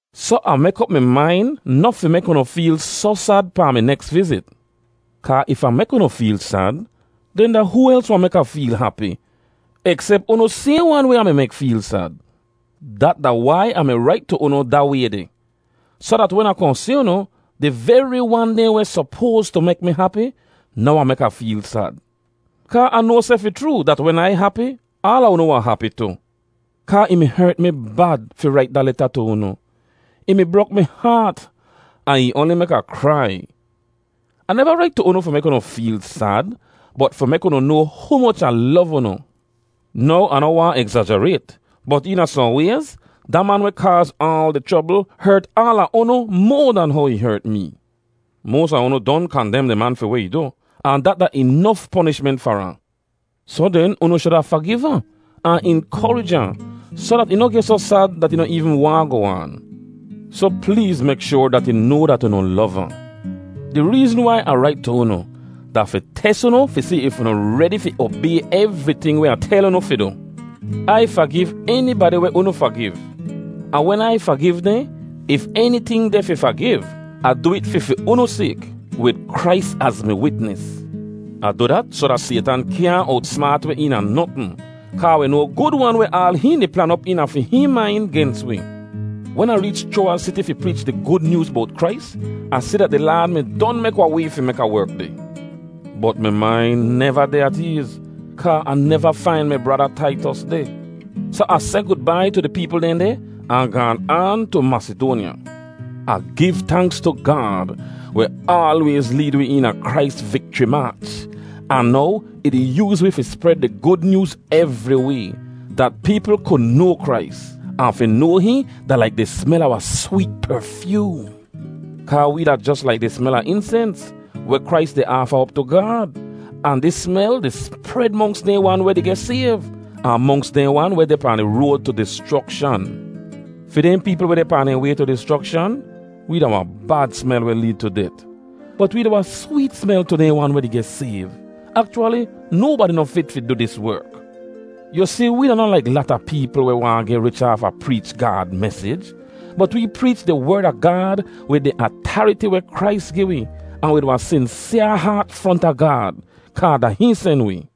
Soh Ah mek op mi main noh fi mek unu feel soh sad pahn mi neks vizit. Kaa if Ah mek unu feel sad, den da hoo els wahn mek Ah feel hapi, eksep unu sayhn wan weh Ah mi mek feel sad? Dat da wai Ah mi rait tu unu da way deh, soh dat wen Ah kohn si unu, di veri wan dehn weh sopoas tu mek mi hapi, noh wahn mek Ah feel sad. Kaa Ah noa seh fi chroo, dat wen Ai hapi, aala unu wahn hapi tu. Kaa ih mi hert mi bad fi rait da leta tu unu; ih mi brok mi haat, ahn ih oanli mek Ah krai. Ah neva rait tu unu fi mek unu feel sad, bot fi mek unu noa humoch Ah lov unu. Now, Ah noh waahn egzajarayt, bot eena sohn wayz, da man weh kaaz aal di chrobl hert aala unu moa dan how ih hert mee. Moas a unu don kandem di man fi weh ih du, ahn dat da inof ponishment far ahn. Soh den, unu shuda fagiv ahn, ahn inkorij ahn, soh dat ih noh geh soh sad dat ih noh eevn waahn goh aan. Soh pleez mek shoar dat ih noa dat unu lov ahn. Di reezn wai Ah rait tu unu, da fi tes unu fi si if unu redi fi obay evriting weh Ah tel unu fi du. Ai fagiv enibadi weh unu fagiv. Ahn wen Ai fagiv dehn, if eniting deh fi fagiv, Ah du it fi fi unu sayk, wid Krais az mi witnis. Ah du dat soh dat Saytan kyaahn owtsmaat wi eena notn. Kaa wi noa gud-wan weh aal hihn di plan op eena fi hihn main gens wi. Wen Ah reech Chroawaz Siti fi preech di Gud Nyooz bowt Krais, Ah si dat di Laad mi don mek wahn way fi mek Ah werk deh. Bot mi main neva deh at eez, kaa Ah neva fain mi brada Taitos deh. Soh Ah seh gudbai tu di peepl dehn deh, ahn gaan aan tu Masidoanya. Ah giv tanks tu Gaad, weh aalwayz leed wi eena Krais vikchri maach. Ahn now, ih di yooz wee fi spred di Gud Nyooz evriway, dat peepl ku noa Krais, ahn fi noa hihn da laik di smel a wahn sweet perfyoom. Kaa wee da jos laik di smel a insens, weh Krais di aafa op tu Gaad, ahn dis smel di spred monks dehn wan weh di geh sayv, ahn monks dehn wan weh deh pahn di road tu dischrokshan. Fi dehn peepl weh deh pahn dehn way tu dischrokshan, wee da wahn bad smel weh leed tu det; bot wee da wahn sweet smel tu dehn wan weh di geh sayv. Akchwali, nobadi noh fit fi du dis werk. Yu si, wee da noh laik lata peepl weh waahn geh rich aafa preech Gaad mesij. Bot wee preech di Werd a Gaad wid di atariti weh Krais gi wi, ahn wid wahn sinsyaa haat fronta Gaad, kaa da hihn sen wi.